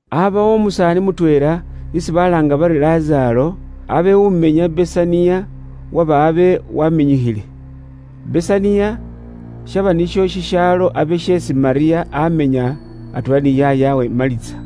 Aabawo umusaani mutweela isi balaanga bari Lazaaro, abe umenya i Besaniya, uwaba abe waminyikhile. Besaniya shaba nisho shishaalo abe sheesi Malyamu amenya, atweela ni yaayawe, Maliza.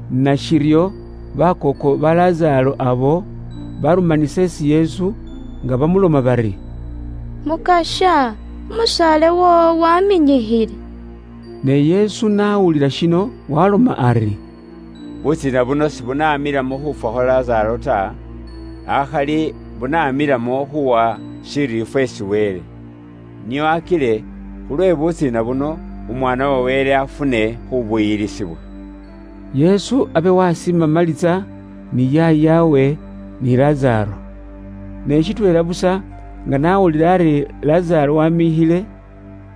Nashiryo bakooko ba Lazaaro abo barumanisa isi Yesu, nga bamuloma bari, “Mukasya, umusaale woowo waminyikhile.” Ne Yesu n'awulila shino waaloma ari, “Butsiina buno sibunaamilamo khuufwa khwa Lazaaro ta, akhali bunaamilamo khuuwa shiriifwa isi Wele. Nio akile khulwe butsiina buno, Umwaana wa Wele afune khuubuyilisibwa.” Yesu abe waasiima Maliza ni yaayawe, ni Lazaaro. Ne shitweela busa nga n'awulila ari Lazaaro waminyikhile,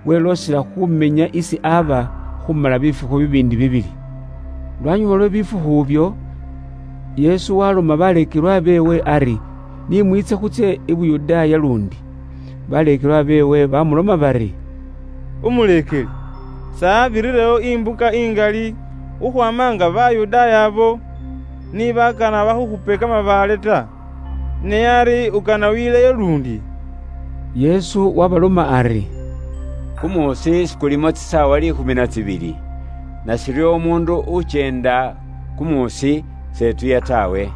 weloosela khumenya isi aba khumala bifukhu bibiindi bibili. Lwanyuma lwe bifukhu ibyo, Yesu waloma baleekelwa beewe ari ni mwiitse khutsye i Yuda luundi. Baleekelwa beewe bamuloma bari, “Umuleekeli, s'abirirewo imbuka ingali khukhwaama nga Bayudaaya abo ni bakana bakhukhupe kamabaale ta; ne ari ukana wileyo luundi?” Yesu waabaloma ari, “Kumuusi sikulimo tsisaawa liikhumi na tsibili? Nashiryo umuundu ukyenda kumuusi s'etuya taawe.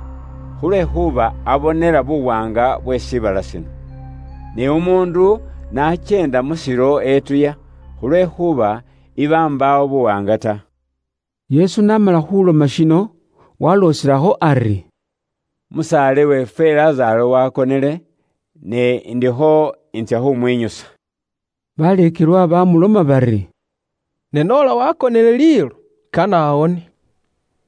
Khulwekhuuba abonela buwaanga bwe shiibala shino. Ne umuundu n'akyeenda mu shilo etuya, khulwekhuuba iba mbaawo buwaanga ta.” Yesu n'amala khuloma shino walooselakho ari, “Umusaale weefwe Lazaaro wakonele; ne indikho intsya khumwinyusa.” Baleekelwa bamuloma bari, “Ne noola wakonele liilo, kane awone.”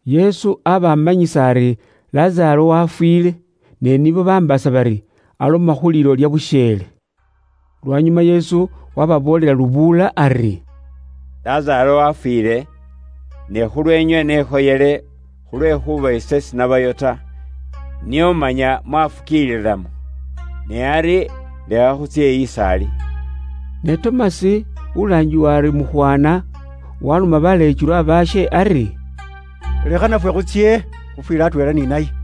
Yesu aba amanyisa ari Lazaaro wafwiile, ne nibo bambaasa bari aloma khu liilo lya busheele. Lwanyuma Yesu waababoolela lubuula ari, “Lazaaro wafwiile. Ne khulweenywe nekhoyele, khulwekhuuba ise sinabayo ta, nio manya mwafukiililamo. Ne ari lekha khutsye is'ali.” Ne Tomasi, ulaangibwa ari Mukhwana, waloma baleekelwa baashe ari, “Lekha nafwe khutsye, khufwile atweela ni naye.”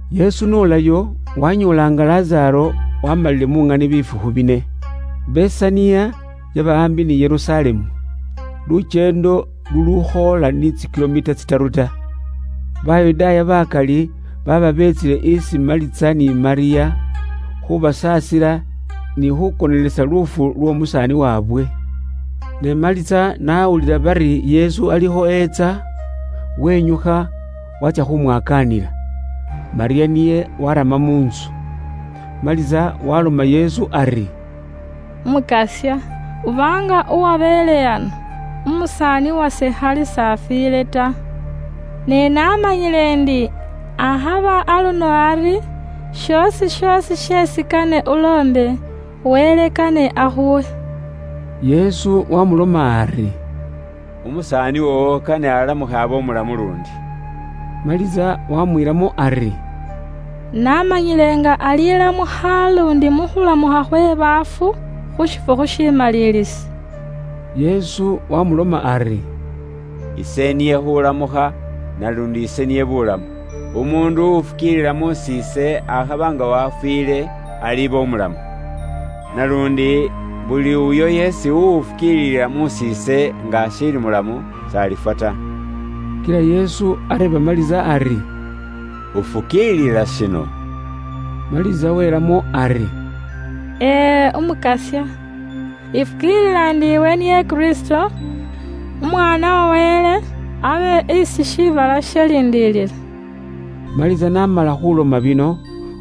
Yesu n'olayo, waanyoola nga Lazaaro waamalile mu ŋani bifukhu bine. Besaniya yaba aambi ni Yerusalemu, lukyeendo lulukhoola ni tsikilomita tsitaru ta. Bayudaaya bakali baaba beetsile isi Maliza ni Malyamu, khubasaasila ni khukonelesa luufu lwa wandayaabwe. Ne Maliza n'awulila Yesu alikho etsa, wenyukha waatsya khumwakaanila. Malyamu niye warama mu ntsu. Maliza waloma Yesu ari, “Umukasya, uba nga uwabeele ano, khali wandaayase s'afwiile ta. Ne namanyile ndi akhaba aluno ari, shoosi shoosi sheesi kane uloombe, Wele kane ashikhuwe.” Yesu wamuloma ari, “Wandaaye woowo alilamukha abe umulamu luundi.” Maliza wamwiilamo ari, “Namanyile nga alilamukha luundi mu khulamukha khwe baafu, khu shifukhu shimaliilisi.” Yesu wamuloma ari, “Ise niye khulamukha, naluundi ise niye buulamu. Umuundu uwufukiilila mus'iise, akhaba nga wafwiile, aliba umulamu. Naluundi, buli uyo yeesi uwufukiilila mus'iise nga ashiili umulamu, s'alifwa ta.” Kila Yesu areeba Maliza ari, “Ufukiilila shino?” Maliza welamo ari, “Ee, Umukasya, ifukiilila ndi iwe niye Kristo, Umwaana wa Wele, abe isi shiibala shaliindilila.” Maliza n'amala khuloma bino,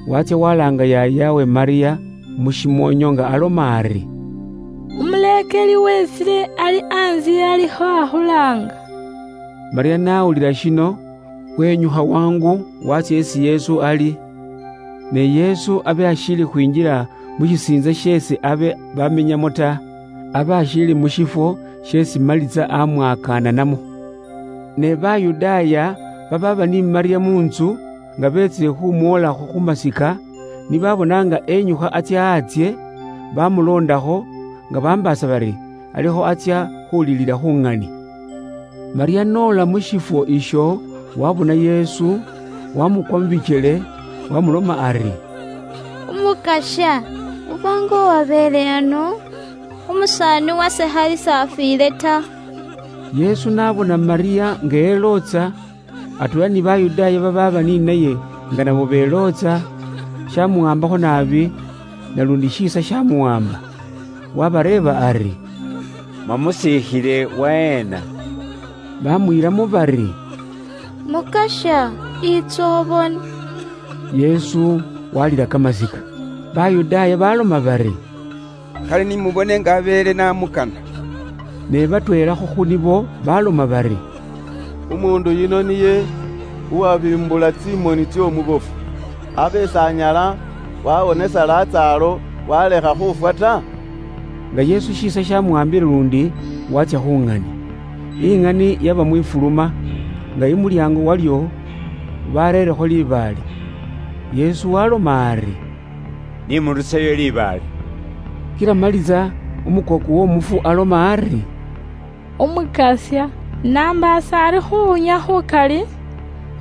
waatsya walaanga yaayawe Malyamu mushimoonyo, nga aloma ari, “Umuleekeli wetsile ali antsye alikho akhulaanga.” Malyamu n'awulila shino, wenyukha wangu waatsya isi Yesu ali. Ne Yesu abe ashiili khwinjila mu shishiitsa sheesi abe bamenyamo ta; abe ashiili mu shifwo sheesi Maliza amwakananamo. Ne Bayudaaya babaaba ni Malyamu mu ntsu, nga beetsile khumwolakho khu masika, ni babona nga enyukha atsya antsye, bamuloondakho, nga bambaasa bari alikho atsya khulilila khu ŋani. Malyamu n'ola mu shifwo isho waabona Yesu, waamukwa mu bikyele waamuloma ari, “Umukasya, uba nga uwabeele ano, khali wandaayase s'afwiile ta.” Yesu n'abona Malyamu nga elootsa, atweela ni Bayudaaya babaaba ni naye nga nabo belootsa, shaamuwaambakho naabi naluundi shiisa shaamuwaamba. Waabareeba ari, “Mwamusiikhile waheena?” Baamwiilamo bari, “Mukasya yiitsa ubone.” Yesu waalila kamasika. Bayudaaya baaloma bari, “Kale ni mubone nga abeele n'amukana!” Ne batweelakho khu nibo baaloma bari, “Umuundu uyuno niye uwabiimbula tsimoni tsy'omubofu, abe s'anyala waawonesa Lazaaro waalekha khufwa ta?” Nga Yesu shiisa shamuwaambile luundi, waatsya khu ŋani. Iŋani yaba mwifuluma, nga imulyaango walyo bareerekho libaale. Yesu waaloma ari, “Ni muruseyo libaale.” Kila Maliza, umukooko w'omufu aloma ari, “Umukasya, nambaasa ari khuwunya khukali,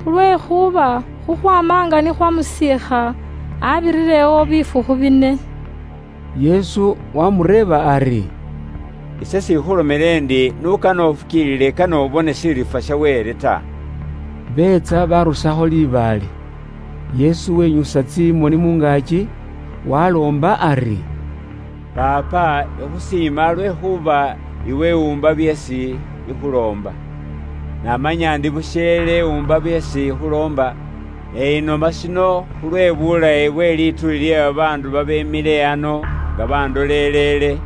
khulwekhuuba khukhwaama nga ni khwamusiikha, abirirewo bifukhu bine.” Yesu waamureeba ari, “Ise s'ikhulomeele iwe ndi n'ukane ufukiilile kane ubone shiriifwa sha Wele ta?” Beetsa barusakho libaale. Yesu wenyusa tsimoni mu ngaaki waloomba ari, “Paapa, ikhusiima lwekhuuba iwe wumba byeesi ikhuloomba. Naamanya ndi busheele uumba byeesi ikhuloomba. Ne inoma shino khulwe buulayi bwe lituuli lye babaandu babeemile ano nga bandoleleele,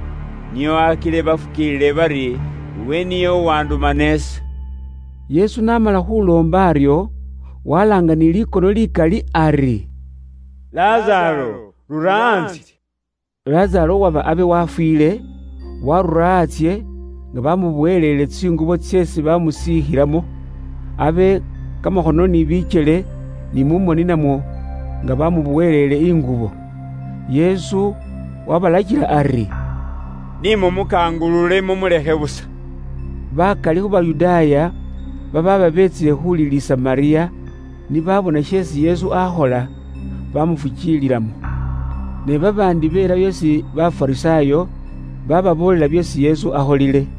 nio akile bafukiilile bari iwe niye uwandumana ise.” Yesu n'amala khuloma aryo, walaanga ni likono likali ari, “Lazaaro, rura antsye!” Lazaaro uwaba abe wafwiile, waarura antsye, nga bamuboweleele tsingubo tseesi bamusiikhilamo. Abe kamakhono ni bikyele, ni mu moni namwo, nga bamuboweleele ingubo. Yesu wabalakila ari, “Nimumukangulule, mumulekhe busa.” Bakali khu Bayudaaya babaaba beetsile khulilisa Malyamu, ni baabona sheesi Yesu akhola, bamufukiililamo. Ne babaandi belayo isi Bafarisaayo, bababoolela byeesi Yesu akholile.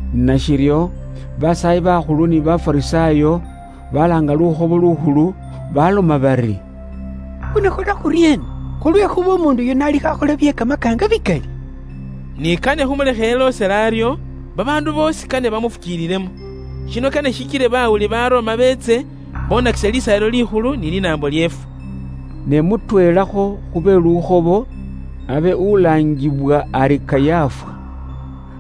Nashiryo basaayi bakhulu ni Bafarisaayo balaanga Lukhobo Lukhulu, baloma bari, “Khunakhola khuryeena? Khulwekhuuba umuundu yuno alikho akhola bye kamakaanga bikali. Ni kane khumulekhe eloosele aryo, babaandu boosi kane bamufukiililemo. Shino kane shikile bawuli Baroma beetse bonakise Lisaayilo Likhulu ni linaambo lyeefwe.” Ne mutweelakho khu be mu lukhobo, abe ulaangibwa ari Kayafa,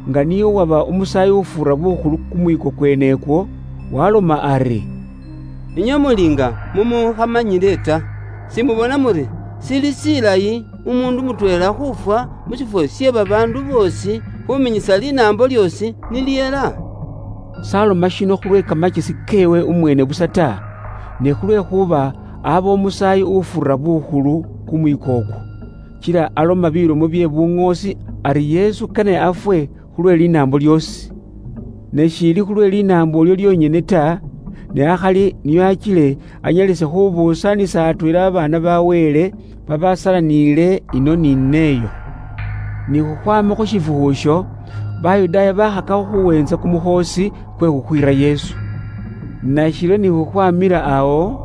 nga niye uwaba Umusaayi ufuura bukhulu kumwiiko kwene ukwo, waaloma ari, “Inywe muli nga mumukhamanyile ta! Simubona muri shili shilayi umuundu mutweela khufwa mu shifwo she babaandu boosi, khuminyisa linaambo lyoosi ni lihela?” Niye s'aloma shino khulwe kamakyesi keewe umweene busa ta, ne khulwekhuuba aba Umusaayi ufuura bukhulu kumwiiko ukwo, kila aloma bilomo bye buŋoosi ari Yesu kane afwe khulwe linaambo lyoosi. Ne shiili khulwe linaambo ilyo lyonyene ta, ne akhali nio akile anyalise khubuusanisa atweela babaana ba Wele babasalaniile ino ni n'eyo. Ni khukhwaama khu shifukhu isho, Bayudaaya bakhakakho khuweentsa kumukhoosi kwe khukhwiira Yesu. Nashiryo ni khukhwamila awo,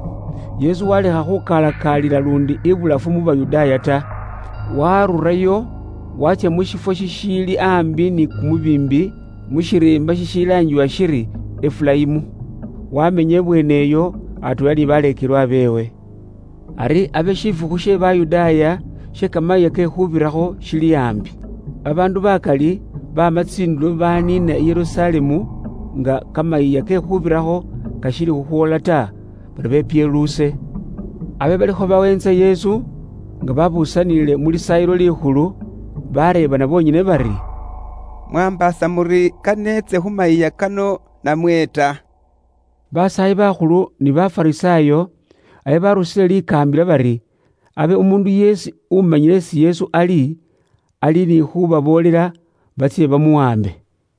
Yesu walekha khukalakaalila luundi abulafu mu Bayudaaya ta. Warurayo waatsya mu shifwo shishiili aambi ni kumubiimbi, mu shiriimba shishilaangibwa shiri Efurayimu. Wamenya ibweene iyo atweela ni baleekelwa beewe. Ari abe shifukhu she Bayudaaya she Kamayiiya ke Khuubirakho shili aambi. Babaandu bakali baama tsindulo baniina i Yerusalemu nga Kamayiiya ke Khuubirakho kashiili khukhwoola ta, bari bepyeluuse. Abe balikho baweentsa Yesu, nga babusaniile mu Lisaayilo Likhulu bareebana bonyene bari, “Mwaambaasa muri kane etse khu mayiiya kano namwe ta?” Basaayi bakhulu ni Bafarisaayo abe barusile likaambila bari abe umuundu yeesi umanyile isi Yesu ali, ali ni khubaboolela, batsye bamuwambe.